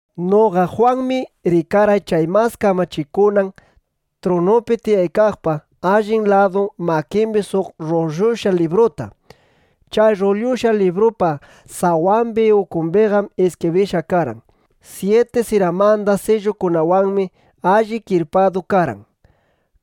Noqa Jwanmi rikarqay chay mas kamachikunan trunupi tiyaykaqpa allin ladu makimbi suq rrullushqa libruta. Chay rrullushqa librupa sawambi ukumbiqam iskibrishqa karqan. Syiti siramanda sillukunawanmi alli kirpadu karqan.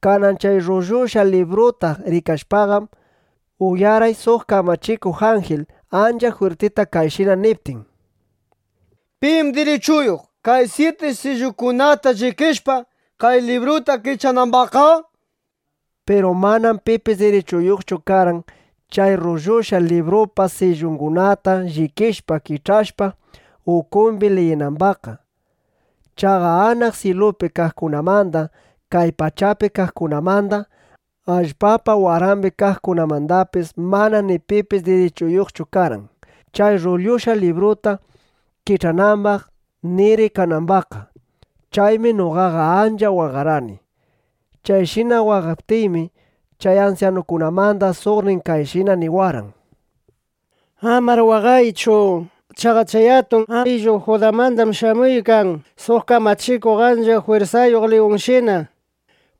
Kanan chay rrullushqa libruta rikashpaqam, uyarqay suq kamachikuq anjil, ancha jwirtita kayshina niptin: —¿Pim dirichuyuq, kay syiti sillukunata llikishpa, kay libruta kich'anambaqqa? nishpa. Piru manam pipis dirichuyuqchu karqan, chay rrullushqa librupa sillungunata llikishpa, kich'ashpa, ukumbi liyinambaqqa. Chaqa anaq syilupi kaqkunamanda, kay pachapi kaqkunamanda, allpapa warambi kaqkunamandapis mana ni pipis dirichuyuqchu karqan, chay rrullushqa libruta kich'anambaq ni rikanambaqqa. Chaymi noqaqa ancha waqarqani. Chayshina waqaykaptiymi, chay ansyanukunamanda suqnin kayshina niwarqan: —Amar waqaychu. Chaqa chay atun ayllu Judamandam shamuykan suq kamachikuq ancha jwirsayuq liyunshina.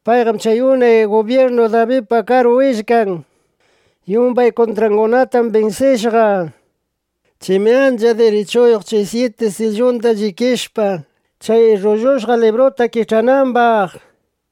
Payqam chay unay gubyirnu Dabidpa karu willkan. Yumbay kuntrangunatam binsishqa. Chaymi ancha dirichuyuq chay syiti sillunda llikishpa, chay rrullushqa libruta kich'anambaq, nishpa.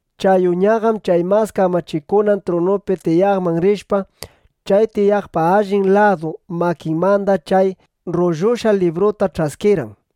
Chay Uñaqam chay mas kamachikunan trunupi tiyaqman rishpa, chay tiyaqpa allin ladu makinmanda chay rrullushqa libruta ch'askirqan.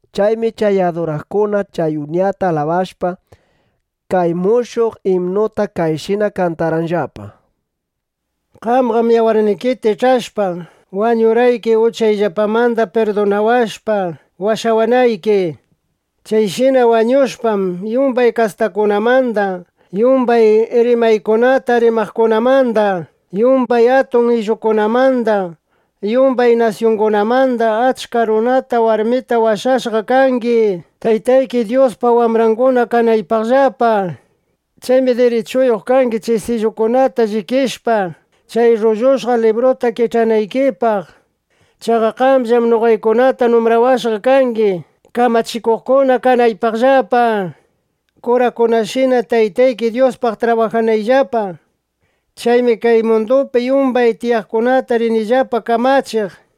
Chaymi chay aduraqkuna chay Uñata alabashpa, kay mushuq imnuta kayshina kantarqanllapa: Qamqam yawarnikita ich'ashpa, wañurqayki, uchayllapamanda pirdunawashpa, washawanayki. Chayshina wañushpam, yumbay kastakunamanda, yumbay rimaykunata rimaqkunamanda, yumbay atun ayllukunamanda, yumbay nasyungunamanda achka runata, warmita washawashqa kangi, Taytayki Dyuspa wambranguna kanaypaqllapa. Chaymi dirichuyuq kangi, chay sillukunata llikishpa, chay rrullushqa libruta kich'anaykipaq. Chaqa qamllam noqaykunata numbrawashqa kangi, kamachikuqkuna kanaypaqllapa, kurakunashina Taytayki Dyuspaq trabajanayllapa. Chaymi kay mundupi yumbay tiyaqkunata rinillapa kamachiq, nishpa.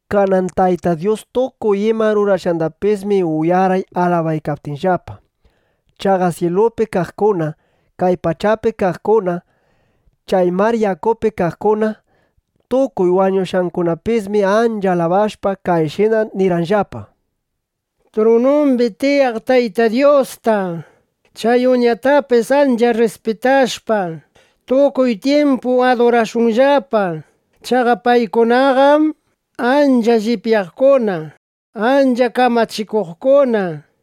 Kanan Tayta Dyus tukuy ima rurashqandapismi uyarqay alabaykaptinllapa. Chaqa syilupi kaqkuna, kay pachapi kaqkuna, chay mar yakupi kaqkuna, tukuy wañushqakunapismi ancha alabashpa, kayshina nirqanllapa: ¡Trunumbi tiyaq Tayta Dyusta, chay Uñatapis ancha rrispitashpa, tukuy tyimpu adurashunllapa! Chaqa paykunaqam ancha llipyaqkuna, ancha kamachikuqkuna, nishpa.